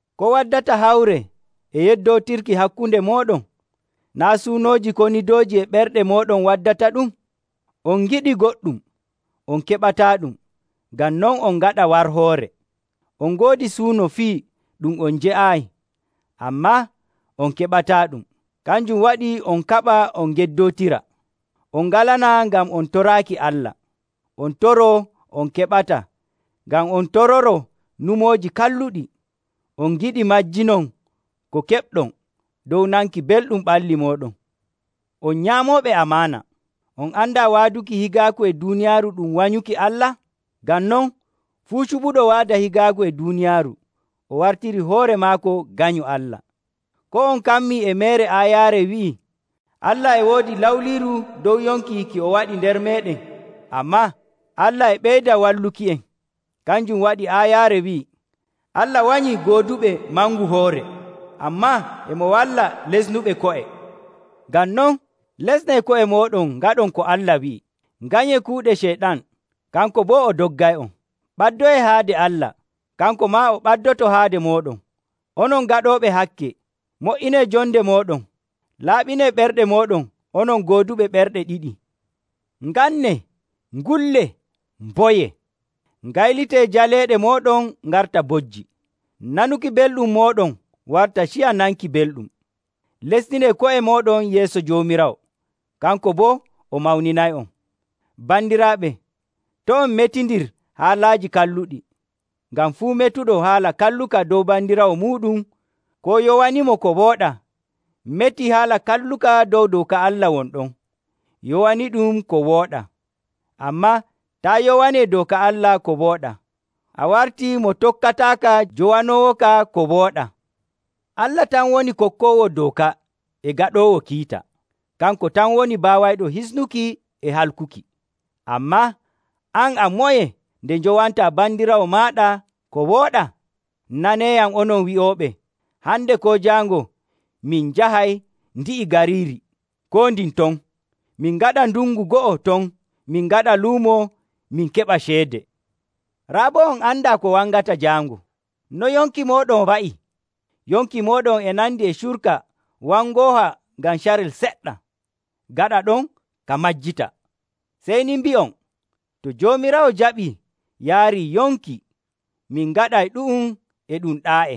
Ko waddata hawre e yeddootirki hakkunde mooɗon? Naa' suunooji konidooji e ɓerɗe mooɗon waddataɗum? On ngiɗii goɗɗum, on keɓataaɗum, ngam non on ngaɗa warhoore. On ngoodi suuno fii ɗum on jeyaayi, ammaa on keɓataaɗum. Kanjum waɗi on kaɓa on ngeddootira. On ngalanaa ngam on toraaki Allah. On toroo on keɓataa ngam on tororoo nyumooji kalluɗi, on ngiɗi majjinon ko keɓɗon dow nanki belɗum ɓalli mooɗon. On nyaamooɓe amaana! On andaa waaduki higaaku e duuniyaaru ɗum wanyuki Allah? Ngam non, fuu cuɓuɗo waada higaaku e duuniyaaru, o wartirii hoore maako ganyo Allah. Koo on kammii e meere aayaare wi'i, “Allah e woodi lawliiru dow yonki ki o waɗi nder meeɗen?” Ammaa Allah e ɓeyda walluki'en. Kanjum waɗi aayaare wi'i, “Allah wanyii gooduɓe mangu hoore, ammaa e mo walla lesnuɓe ko'e.” Ngam non, lesnee ko'e mooɗon ngaɗon ko Allah wi'i. Nganyee kuuɗe Ceyɗan, kanko boo o doggay'on. Ɓaddoyee haade Allah, kanko maa o ɓaddoto haade mooɗon. Onon gaɗooɓe hakke, mo''inee jonde mooɗon. Laaɓinee ɓerɗe mooɗon, onon gooduɓe ɓerɗe ɗiɗi. Ngannee, ngullee, mboyee. Ngaylitee jaleeɗe mooɗon ngarta bojji, nanuki belɗum mooɗon warta ciya nanki belɗum. Lestinee ko'e mooɗon yeeso Joomiraawo, kanko boo o mawninay'on. Bandiraaɓe, to' on metindir haalaaji kalluɗi. Ngam fuu metuɗo haala kalluka dow bandiraawo muuɗum, koo yowanimo ko wooɗaa, metii haala kalluka dow dooka Allah won ɗon, yowaniiɗum ko wooɗaa. Ammaa taa yowanii dooka Allah ko wooɗaa, a wartii mo tokkataaka jowanoowoka ko wooɗaa. Allah tan woni kokkoowo dooka e gaɗoowo kiita. Kanko tan woni baawayɗo hisnuki e halkuki. Ammaa an a moye nde njowantaa bandiraawo maaɗa ko wooɗaa? Naneeyam onon wi'ooɓe, “Hande koo jaango min njahay ndi'i gariiri koo ndin ton, min ngaɗa ndungu go'o ton min ngaɗa luumo min keɓa ceede.” Raa boo on andaa ko wangata jaango. No yonki mooɗon wa'i? Yonki mooɗon e nandi e curka wangooha ngam carel seɗɗa, gaɗa ɗon ka majjita. Sey ni mbi'on, “To Joomiraawo jaɓii yaarii yonki, min ngaɗay ɗu'um e ɗum ɗaa'e.”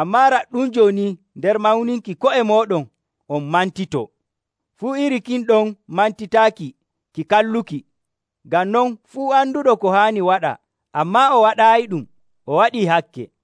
Ammaa raɗɗum jooni nder mawninki ko'e mooɗon on mantitoo. Fuu iri kin ɗon mantitaaki ki kalluki. Ngam non fuu anduɗo ko haani waɗa, ammaa o waɗaayiɗum, o waɗii hakke.